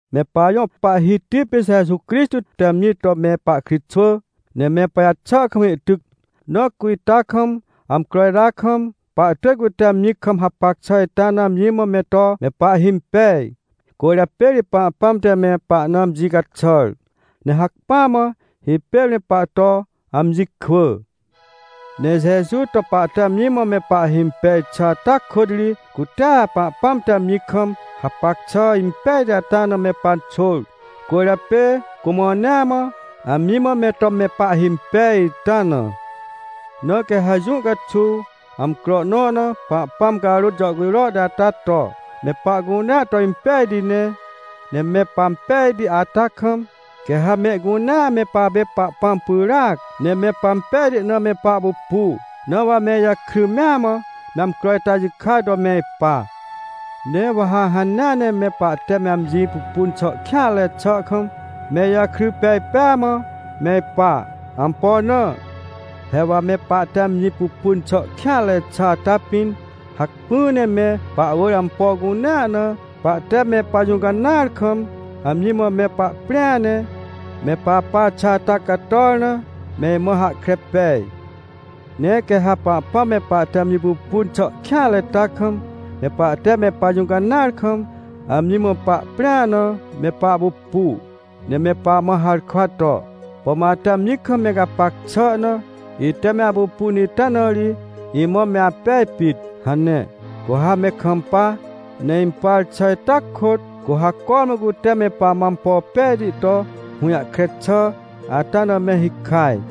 Me pajõ Pahhiti pê Jeju Crixtô te amji to me pahkritxwỳ, ne me pajaxà kam ihtyc. Na cu ita kam, amcro ita kam, pahtỳj cute amji kam hapac xà ita na amji mã me to me pahhimpej. Cwỳrjapê ri Pahpãm te me pahna amji caxàr, ne hacpỹa mã hipêr me pahto amji kwỳ. Ne Jeju to pahte amji mã me pahhimpej xà ata kôt ri, cutea Pahpãm te amji kam hapac xà impejti ita na me panxôr. Cwỳrjapê cu mãnea mã, amji mã me to me pahhimpej ita na. Na quê ha jũ caxuw, amcro nõ na, Pahpãm carôt jàhcujro ata to, me pahcunea to impejti ne. Ne me pampejti ata kam, quê ha mehcunea me papê Pahpãm pyràc, ne me pampejti na me pahpupu. Na wa me ijakry mea mã me amcro ita jikaj to me ipa. Ne wa ha hanea ne me pahte me amji pupun xà kêanre xà kam, me ijakry pej pêa mã me ipa. Ampo na? He wa me pahte amji pupun xà kêanre xà ata pĩn, hacpỹ ne me pahwỳr ampo cunea na pahte me pajũcanãar kam amji mã me pahprĩa ne, me papa xà ata cator na, me imã hahkre pej. Ne quê ha Pahpãm me pahte amji pupun xà kêanre ita kam, me pahte me pajũcanãar kam, amji mã pahprĩa na me pahpupu, ne me pamã harkwa to: — Pom ate amji kam me gapac xà na, ite me apupun ita na ri imã me apej pit — hane. Cu ha me kampa, ne impar xà ita kôt, cu ha cormã cute me pamã ampo pejti to hũjahkre xà ata na me hikaj.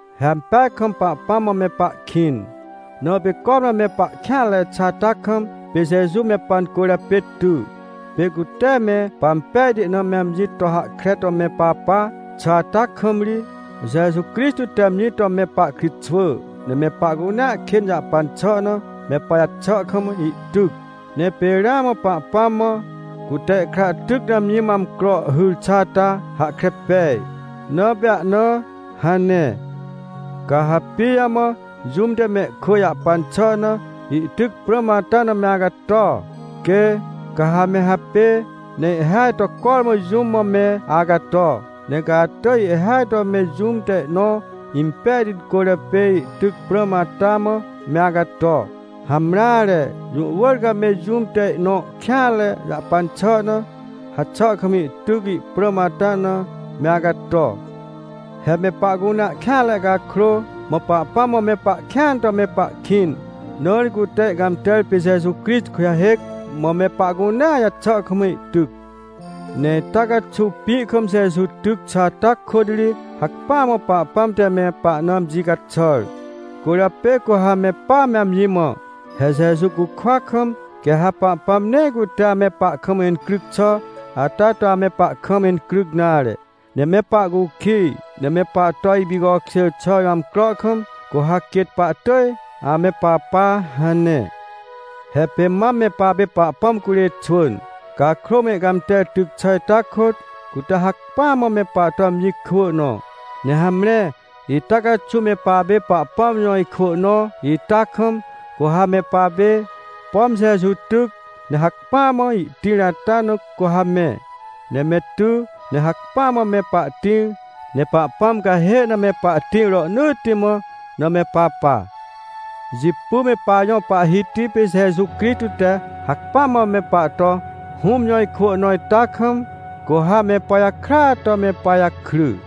He ampeaj kam Pahpãm mã me pahkĩn, na pê cormã me pahkêanre xà ata kam, pê Jeju me pancwỳrjapê ty. Pê cu tee me pampejti na ame amji to hahkre to me papa xà ata kam ri, Jeju Crixtô te amji to me pahkritxwỳ, ne me pahcunea kên jahpan xà na, me pajaxà kam ihtyc. Ne pê ramã Pahpãm mã, cute ihkra tyc na amji mã amcro hyr xà ata hahkre pej, na pê ahnaa hane. Ca ha pijamã jũm te mehkwỳ jahpan xà na ihtyc prãm ata na me acato? Quê! Ca ha ame hapêê ne ihhêaj to cormã jũm mã me acato. Ne ca atỳj ihhêaj to me jũm te ihnõ impejti cwỳrjapê ihtyc prãm ata mã me acato. Hamreare, jũ wỳr ca me jũm te ihnõ kêanre jahpan xà na, haxà kam ihtyc ihprãm ata na me acato. He me pahcunea kêanre cakrô, mã Pahpãm mã me pahkĩan to me pahkĩn, na ri cute ihcãmter pê Jeju Crixtô kujahêc, mã me pahcunea jaxà kam ihtyc. Ne ita caxuw pĩ kam Jeju tyc xà ata kôt ri hacpỹa mã Pahpãm te me pahna amji caxàr. Cwỳrjapê cu ha me pa, me amji mã: — He Jeju cukwa kam, quê ha Pahpãm nee cute ame pahkam incryc xà ata to ame pahkam incryc nare. Ne me pahcukij, ne me pahto ipicokjêr xà jõ amcro kam, cu ha quêt pahtỳj ame papa — hane. He pê mam me papê Pahpãm curê xwỳn. Cakrô mã ihcãmter tyc xà ita kôt, cute hacpỹa mã me pahto amji kwỳ nõ. Ne hamre, ita caxuw me papê Pahpãm jõ ikwỳ nõ ita kam, cu ha me papê, pom Jeju tyc, ne hacpỹa mã ihtĩr ata na cu ha me, ne me ty, ne hacpỹa mã me pahtĩr, ne Pahpãm cahê na me pahtĩr rohnỳtti mã na me papa. Jipy me pajõ Pahhiti pê Jeju Crixtô te hacpỹa mã me pahto Hũm jõ ikwỳ nõ ita kam, cu ha me pajakrya to me pajakry.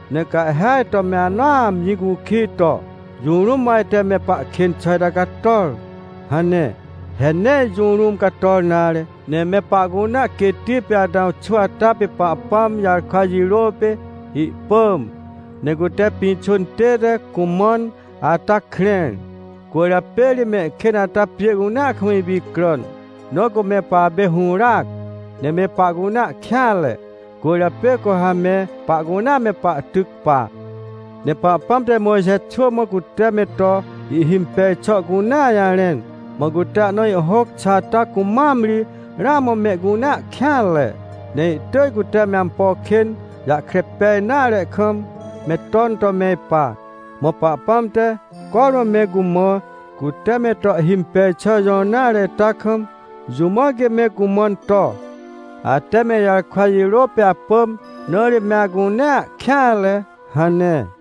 Ne ca ihhêaj to me anõa amji cukij to: — Jũ rũm mã ajte me pahkên xà ita cator? — hane. He nee jũ rũm cator nare, ne me pahcunea quêtti pê Atãw xwỳ ata pê Pahpãm jarkwa jirô pê ihpỳm, ne cute pĩxô intête cumãn ata krẽr. Cwỳrjapê ri mehkên ata pjê cunea kam ipicràn. Na cu me papê hũràac, ne me pahcunea kêanre, cwỳrjapê cu ha me pahcunea me pahtyc pa. Ne Pahpãm te Mojxe xwỳ mã cute me to ihhimpej xà cunea jarẽn. Mã cute ahna ihhôc xà ata cumam ri ramã mehcunea kêanre, ne ihtỳj cute me ampo kên jahkre pej nare kam, me ton to me ipa. Mã Pahpãm te, cormã me cumã cute me to ihhimpej xà jõr nare ita kam, jũ mã quê me cumãn to: “Ate me ijarkwa jirô pê apỳm, na ri me acunea kêanre” hane.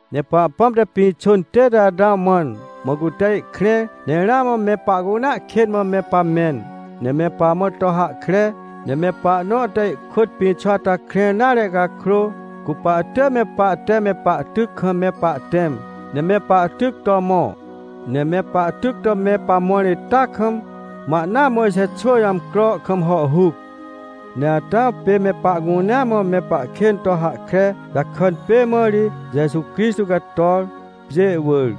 Ne Pahpãm te pĩxô intête Atãw mãn, mã cute ihkrẽr, ne ramã me pahcunea kên mã me pamẽn, ne me pamã to hahkre. Ne me pahnõ te ihkôt pĩxô ata krẽr nare cakrô, cu pahtỳj me pahte me pahtyc kam me pahtẽm, ne me pahtyc to mõ. Ne me pahtyc to me pamõr itaa kam, mã ahnaa Mojxe xwỳ jõ amcro kam hàhhuc. Ne Atãw pê me pahcunea mã me pahkên to hahkre jakàn pê mã ri Jeju Crixtô cator, pjê wỳr.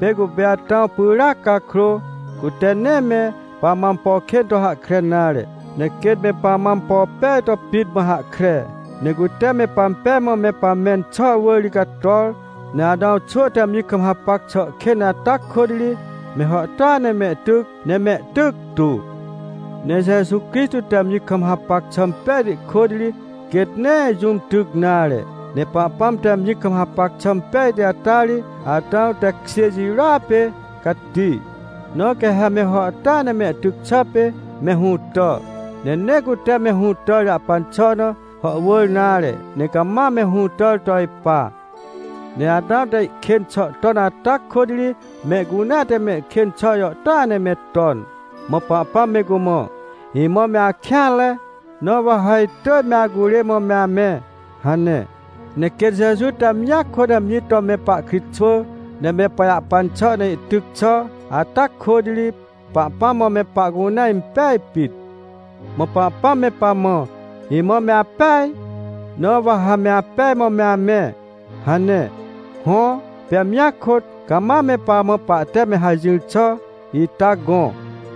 Pê cupê Atãw pyràac cakrô, cute nee me pamã ampo kên to hahkre nare, ne quêt me pamã ampo pej to pit mã hahkre, ne cute me pampej mã me pamẽn xà wỳr ri cator. Ne Atãw xwỳ te amji kam hapac xà kên ata kôt ri me hàhtôa ne mehtyc, ne mehtyctu. Ne Jeju Crixtô te amji kam hapac xà pejti kôt ri, quêt nee jũm tyc nare. Ne Pahpãm te amji kam hapac xà pejti ata ri Atãw tekjê jirôa pê cati. Na quê ha me hàhtôa ne mehtyc xà pê me hũtà. Ne nee cute me hũtàr jahpan xà na hàhwỳr nare, ne cama me hũtàr to ipa. Ne Atãw te ihkên xà ton ata kôt ri mehcunea te mehkên xà jàhtôa ne me ton. Mã Pahpãm me cumã: — Imã me akêanre, na wa ha itỳj me acurê mã me amẽ — hane. Ne quêt Jeju te amjia kôt amji to me pahkritxwỳ, ne me pajahpan xà na ihtyc xà ata kôt ri, Pahpãm mã me pahcunea impej pit. Mã Pahpãm me pamã: — Imã me apeaj, na wa ha me apej mã me amẽ — hane. Hõ, pê amjia kôt, cama me pamã pahte me hajỹr xà ita gõ.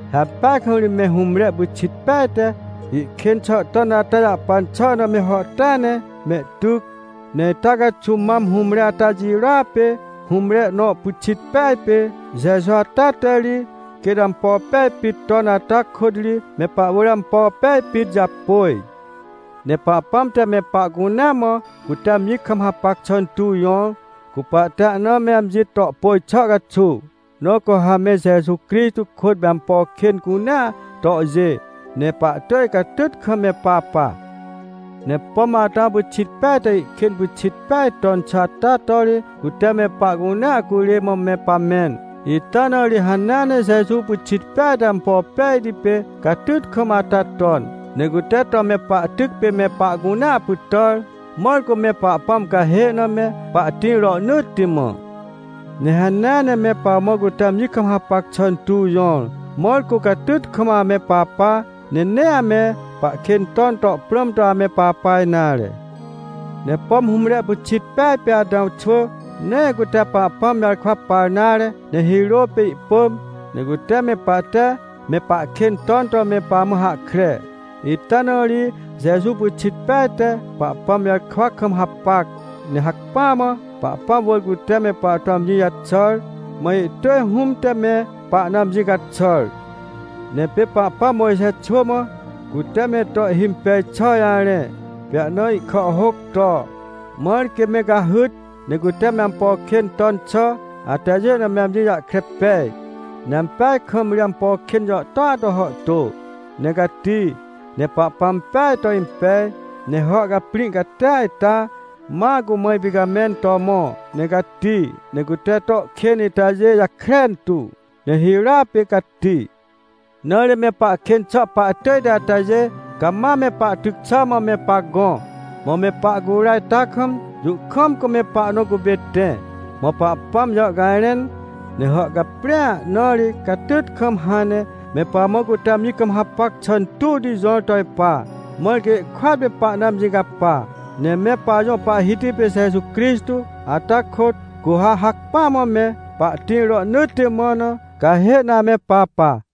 He ampeaj kam ri me hũmre pyxit peaj te ihkên xà ton ata jahpan xà na me hàhtôa ne mehtyc. Ne ita caxuw mam hũmre ata jirôa pê, hũmre nõ pyxit peaj pê Jeju ata te ri, quêt ampo pej pit ton ata kôt ri me pahwỳr ampo pej pit japôj. Ne Pahpãm te me pahcunea mã cute amji kam hapac xà intuw jõr, cu pahte ahna me amji to pôj xà caxuw. Na cu ha me Jeju Crixtô kôt me ampo kên cunea tohjê, ne pahtỳj catyt kam me papa. Ne pom Atãw pyxit peaj te ihkên pyxit peaj ton xà ata to ri, cute me pahcunea curê mã me pamẽn. Ita na ri hanea ne Jeju pyxit peaj te ampo pejti pê catyt kam ata ton, ne cute to me pahtyc pê me pahcunea pytàr, mãr cu me Pahpãm cahê na me pahtĩr rohnỳtti mã. Ne hanea ne me pamã cute amji kam hapac xà intuw jõr, mãr cu catyt kam ame papa, ne nee ame pahkên ton to prãm to ame papa nare. Ne pom hũmre pyxit peaj pê Atãw xwỳ, nee cute Pahpãm jarkwa par nare, ne hirô pê ihpỳm, ne cute me pahte me pahkên ton to me pamã hahkre. Ita na ri Jeju pyxit peaj te Pahpãm jarkwa kam hapac, ne hacpỹa mã Pahpãm wỳr cute me pahto amji jaxàr, mã ihtỳj Hũm te me pahna amji caxàr. Ne pê Pahpãm Mojxe xwỳ mã, cute me to ihhimpej xà jarẽ, pê ahna ihkàhhôc to, mãr quê me cahyt, ne cute me ampo kên ton xà atajê na me amji jahkre pej. Ne ampeaj kam ri ampo kên jàhtôa to hàhtô, ne cati. Ne Pahpãm peaj to impej, ne hàhcaprĩ catia ita, ma cumã ipicamẽn to mõ, ne cati. Ne cute to kên itajê jakren tu, ne hirôa pê cati. Na ri me pahkên xà pahtỳjti atajê cama me pahtyc xà mã me pagõ, mã me pahcura ita kam, jũ kam cu me pahnõ cupê tẽ. Mã Pahpãm jàhcajrẽn, ne hàhcaprĩa na ri catyt kam hãn ne me pamã cute amji kam hapac xà intuwti jõr to ipa, mãr quê ihkôat me pahna amji capa. Ne me pajõ Pahhiti pê Jeju Crixtô ata kôt, cu ha hacpỹa mã me pahtĩr rohnỳtti mã na, cahê na ame papa.